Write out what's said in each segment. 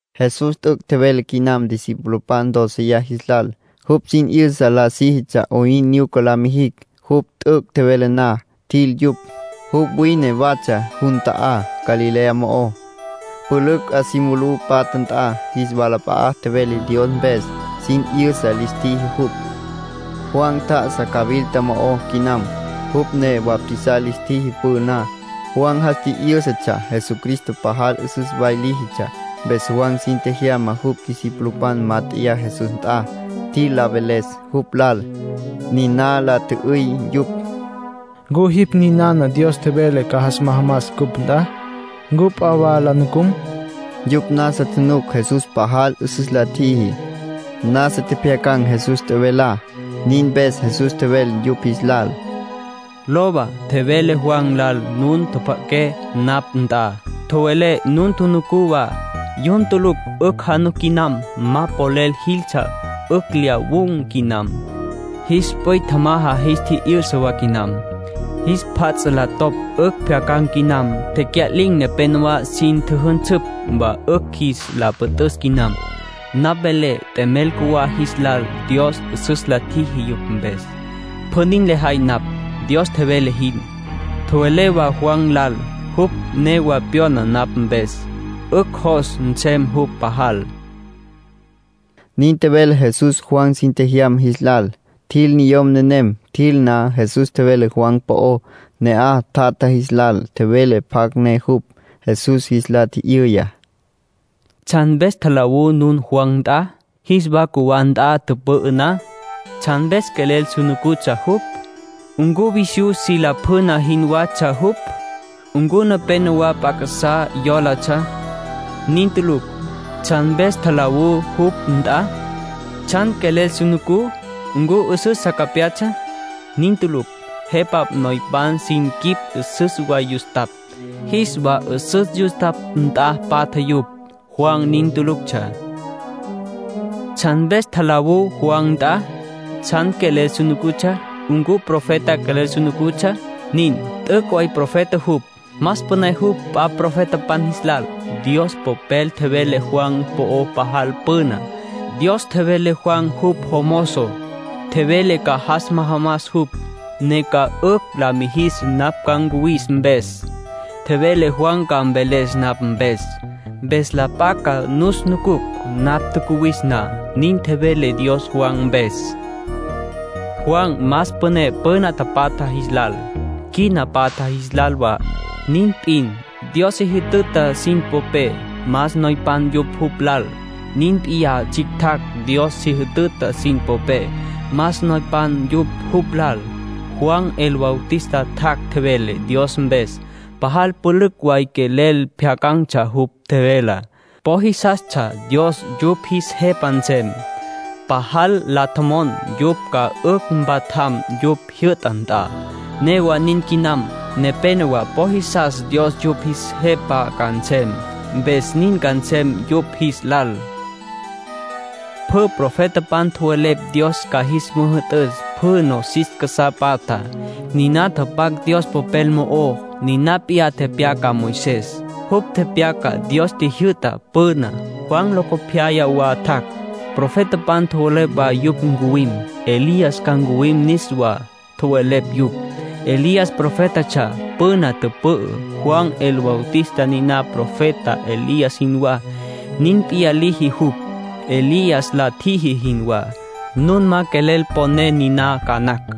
Jesús t'üc' tjevele quinam discipulopan dóceya jis lal. Jupj sin 'yüsa la síjitsja 'oyn nyuca la mijicj. Jupj t'üc' tjevele na, tjil yupj. Jupj wine watsja jun ta'á Galilea mo'ó, pülücj 'a mulú patja nt'a. Jis walap'a'a tjevele Dios mpes, sin 'yüsa lis tjiji jupj. Juan tjá'asa cawilta mo'ó quinam. Jupj ne bautizar lis tjiji püná. Juan jas tji'yǘsatsja Jesucristo pajal 'üsüs way líjitsja. Mpes Juan sin tjejyama jupj discipulopan mát'eya Jesús nt'a, tjil la veles jupj lal. Niná la tjü'üy yupj: —¿Ncu jipj ninana Dios tjevele ca jas majamas cupj nt'a? ¿Ncu p'a wa la nucum? (Yupj nasa tjunuc Jesús pajal 'üsüs la tjiji. Nasa tjepjyacan̈ Jesús tjevelá.) Nin mpes Jesús tjevele yupj jis lal: —Lowa, tjowelé Juan lal nun tjapja'aqué napj nt'a, tjowelé nun tjunucú wa. Yun tulucj 'ücj januc quinam. Ma polel jiltsja 'ücj lyawun̈ quinam. Jis p'üy tjamaja jis tji'yü'sa wa quinam. Jis pjat la topj 'ücj pjyacan̈ quinam. Tecya'lin̈ nepenowá sin tjüjünsüpj wa 'ücj jis la püt'üs quinam. Napj velé t'emel cjuwá jis lal Dios 'üsüs la tjiji yupj mpes. Pjü nin lejay napj, Dios tjevele jin. Tjowelé wa Juan lal: jupj newa pyona napj mpes, 'ücj jos nsem jupj pajal —nin tjevele Jesús Juan sin tjejyama jis lal. Tjil niyom nenem. Tjil na, Jesús tjevele Juan po'ó ne'aj tjatja jis lal. Tjevele pjacj ne jupj. Jesús jis la tji'yüya: “¿Tsjan mpes tjalawú nun Juan nt'a, jis wa cjuwá nt'a tüpü'ü na? ¿Tsjan mpes quelel su nucutsja jupj? ¿Ncu visyú si lapjüna jinwatsja jupj? ¿Ncu nenéyawa p'a casá jólatsja? Nin tulucj. ¿Tsjan mpes tjalawú jupj nt'a? ¿Tsjan quelel su nucutsja? ¿Ncu 'üsüs sa capyatsja? Nin tulucj. Jepa noypan sin quip 'üsüs way yustapj. Jis wa 'üsüs yustapj nt'a patja yupj. Juan nin tuluctsja. ¿Tsjan mpes tjalawú Juan nt'a? ¿Tsjan quelel nucutsja? ¿Ncu profeta quelel nucutsja? Nin. T'üc' way profeta jupj. Más püné jupj p'a profetapan jis lal. Dios Popel tjevele Juan po'ó pajal püna. Dios tjevele Juan jupj jomozo. Tjevele ca jas majamas jupj, ne ca 'ücj la mijis napj ca ncuwis mpes. Tjevele Juan ca mveles napj mpes, mpes la p'a ca nus nucucj napj tjacuwis na. Nin tjevele Dios Juan mpes. Juan más püné püna tapatja jis lal, quina patja jis lal wa. Nin p'in, Dios si jütüta sin popé más noypan yupj jupj lal. Nin p'iyá tsjictjacj Dios si jütüta sin popé: más noypan yupj jupj lal. ”Juan el Bautista tjac', tjevele Dios mpes. Pajal pülücj way quelel pjyacan̈tsja jupj tjevelá. Po jisastsja Dios yupj jis Jepa nsem. Pajal la tjomon yupj ca 'ücj mpatjam jupj jyü'ta nt'a. Newa nin quinam. Nepénowa po jisas Dios yupj jis Jepa ca nsem, mpes nin ca nsem yupj jis lal. Pjü profetapan tjowelepj Dios ca jis müjü'tüs pjü nosis casá patjá. Niná tapac Dios Popel mo'ó. Niná p'iyá tepyaca Moisés. Jupj tepyaca Dios tjijyü'ta püná. Juan locopyaya wa tjac'. Profetapan tjowelepj wa jupj ncuwim. Elías ca ncuwim niswá, tjowelepj yupj. Elías profétatsja püna tüpü'á. Juan el Bautista niná profeta Elías jinwá. Nin p'iyá liji jupj, Elías la tjiji jinwá. Nun ma quelel poné niná ca nacj.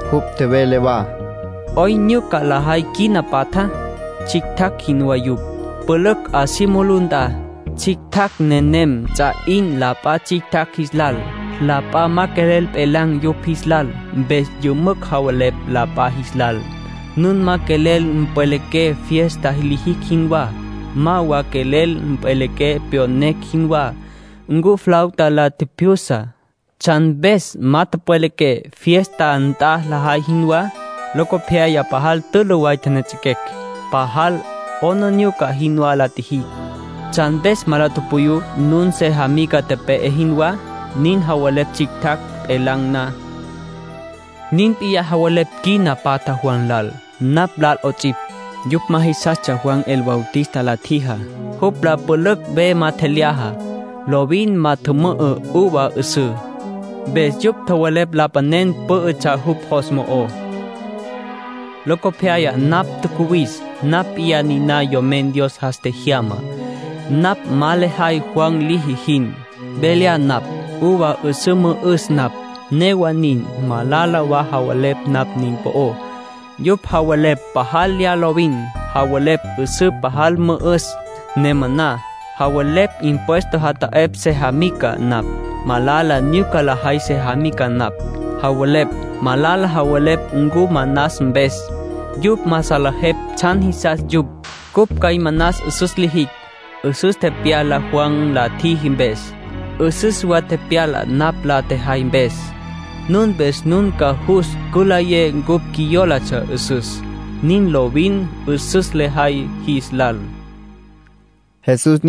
Jupj tjevele wa: “¿'Oyn nyuca lajay quina patjá? Tsjictjacj jinwá yupj, pülücj 'a si mulú nt'a. Tsjictjacj nenem ts'a 'in la p'a tsjictjacj jis lal, la p'a ma quelel pjelan̈ yupj jis lal. Mpes yümücj javelepj la p'a jis lal: ‘Nun ma quelel pjwelequé fiesta lijicj jinwá. Ma wa quelel pjwelequé tyoquecj jinwá. Cupj flauta la tjipjyusacj. ¿Tsjan mpes ma tjüpjwelequé, fiesta nt'a lajay jinwá? Locopyaya pajal tülü way tjenejets'equecj. Pajal 'aplijila jinwá la tjijicj. ¿Tsjan mpes ma la tupuyú, nun sejamica tepe'e jinwá?’ Nin javelepj tsjictjacj pjelan̈ na. Nin p'iyá javelepj quina patjá Juan lal, napj lal 'ots'ipj. Yupj ma jisastsja Juan el Bautista la tjijá. Jupj la pülücj ve ma tjelyaja. Lovin ma tjümü'ü uva 'üsǘ. Mpes yupj tjowelepj lapanen pǘ'ütsja jupj jos mo'ó. Locopyaya napj tjacuwis. Napj p'iyá niná Yomen Dios jas tjejyamá. Napj ma lejay Juan liji jin. Ve lya napj. Uva 'üsǘ mü'üs napj. Newa nin, malala wa javelepj napj nin po'ó. Yupj javelepj pajal lya lovin. Javelepj 'üsǘ pajal mü'üs, ne maná. Javelepj impuesto jata'epj sejamica napj. Malala nyuca lajay sejamica napj, javelepj. Malala javelepj ncupj manas mpes. Yupj ma salejepj tsjan jisas yupj. Cupj cjay manas 'üsüs lijicj. 'Üsüs tepyala Juan la tjiji mpes. 'Üsüs wa tepyala napj la tjejay mpes. Nin mpes nun ca jus cülayé cupj qjuiyólatsja 'üsüs. Nin lovin 'üsüs lajay jis lal”, tjevele Jesús.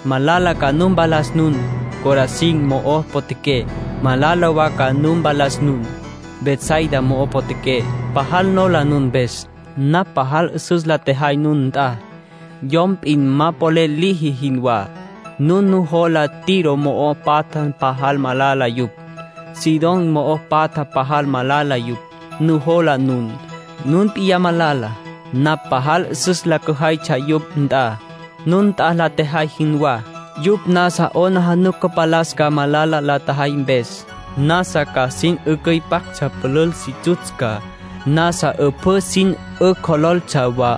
“Malala ca nu mpalas nun, Corazín mo'o potjaqué. Malala wa ca nu mpalas nun, Betsaida mo'o potjaqué. Pajal nola nun mpes. Napj pajal 'üsüs la tjejay nun nt'a, yom p'in ma polel liji jinwá. Nun nujola Tiro mo'o patja pajal malala yupj. Sidón mo'o patja pajal malala yupj, nujola nun. Nun p'in malala. Napj pajal 'üsüs la cüjaytsja yupj nt'a, nun nt'a la tjejay jinwá, yupj nasa ca 'aplijila cüpalastsja malala la tjajay mpes. Nasa ca sin 'ücüipaptsja pülül si tsutsca, nasa 'üpjǘ sin 'ücjololtsja wa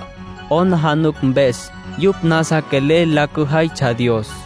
'aplijila mpes. Yupj nasa quelel la cüjaytsja Dios.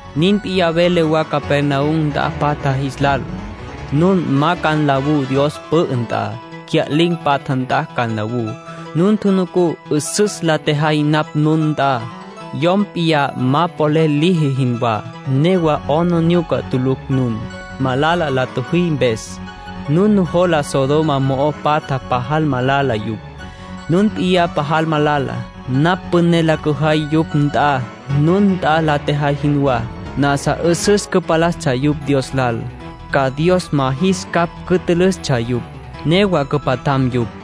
”Nin p'iyá velé wa Capernaum nt'a patja jis lal. Nun ma ca nlawú Dios pü'ü nt'a. Tecya'lin̈ patja nt'a ca nlawú. Nun tjunucú 'üsüs la tjejay napj nun nt'a, yom p'in ma polel liji jinwá. Newa 'aplijila tulucj nun, malala la tjüjí mpes. Nun nujola Sodoma mo'o tapatjá pajal malala yupj. Nun p'in pajal malala. Napj püné la cüjaytsja yupj nt'a, nun nt'a la tjejay jinwá, nasa 'üsüs cüpalastsja yupj Dios lal. Ca Dios ma jis capj cütülüstsja yupj. Newa cüpatjam yupj.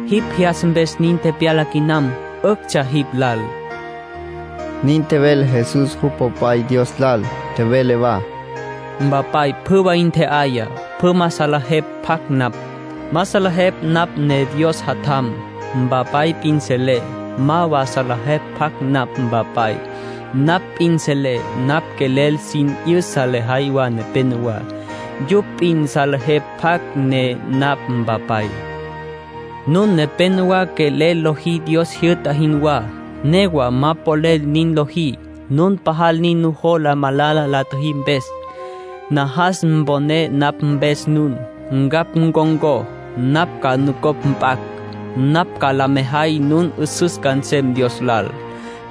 Jipj jyastsja mpes nin tepyala quinam. 'Üctsja jipj lal”, nin tjevele Jesús jupj Popay Dios lal. Tjevele wa: “Mpapay pjü way ntje'aya. Pjü ma salejepj pjacj napj. Ma salejepj napj ne Dios Jatjam. Mpapay p'in selé. Ma wa salejepj pjacj napj Mpapay. Napj p'in selé. Napj quelel sin 'yüsa lejay wa nepenowá. Yupj p'in salejepj pjacj ne napj Mpapay. Nun nepenowá quelel lojí Dios jyü'ta jinwá, newa ma polel nin lojí. Nun pajal nin nujola malala la tjüjí mpes. Najas mponé napj mpes nun. Ncapj ncon̈có. Napj ca nucopj mp'acj. Napj ca la mejay nun 'üsüs ca nsem Dios lal.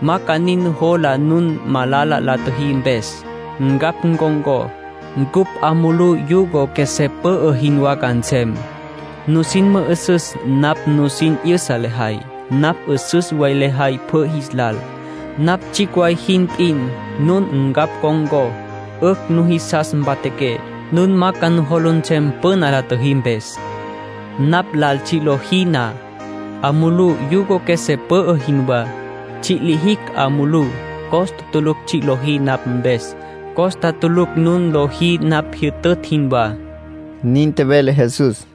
Ma ca nin nujola nun malala la tjüjí mpes. Ncapj ncon̈có. Cupj 'a mulú yugo qjuesé pü'ü jinwá ca nsem. Nusin mü'üsüs napj nusin 'yüsa lejay. Napj 'üsüs way lejay pjü jis lal. Napj tsjicj way jin p'in. Nun ncapj con̈có, 'ücj nujisas mpatjaqué. Nun ma ca nujola nsem püna la tjüjí mpes. Napj lal tsji' lojí na, 'a mulú yugo qjuesé pü'ü jinwá. Tsji' lijicj 'a mulú. Costa tulucj tsji' lojí napj mpes. Costa tulucj nun lojí napj jyütütj jinwá”, nin tjevele Jesús.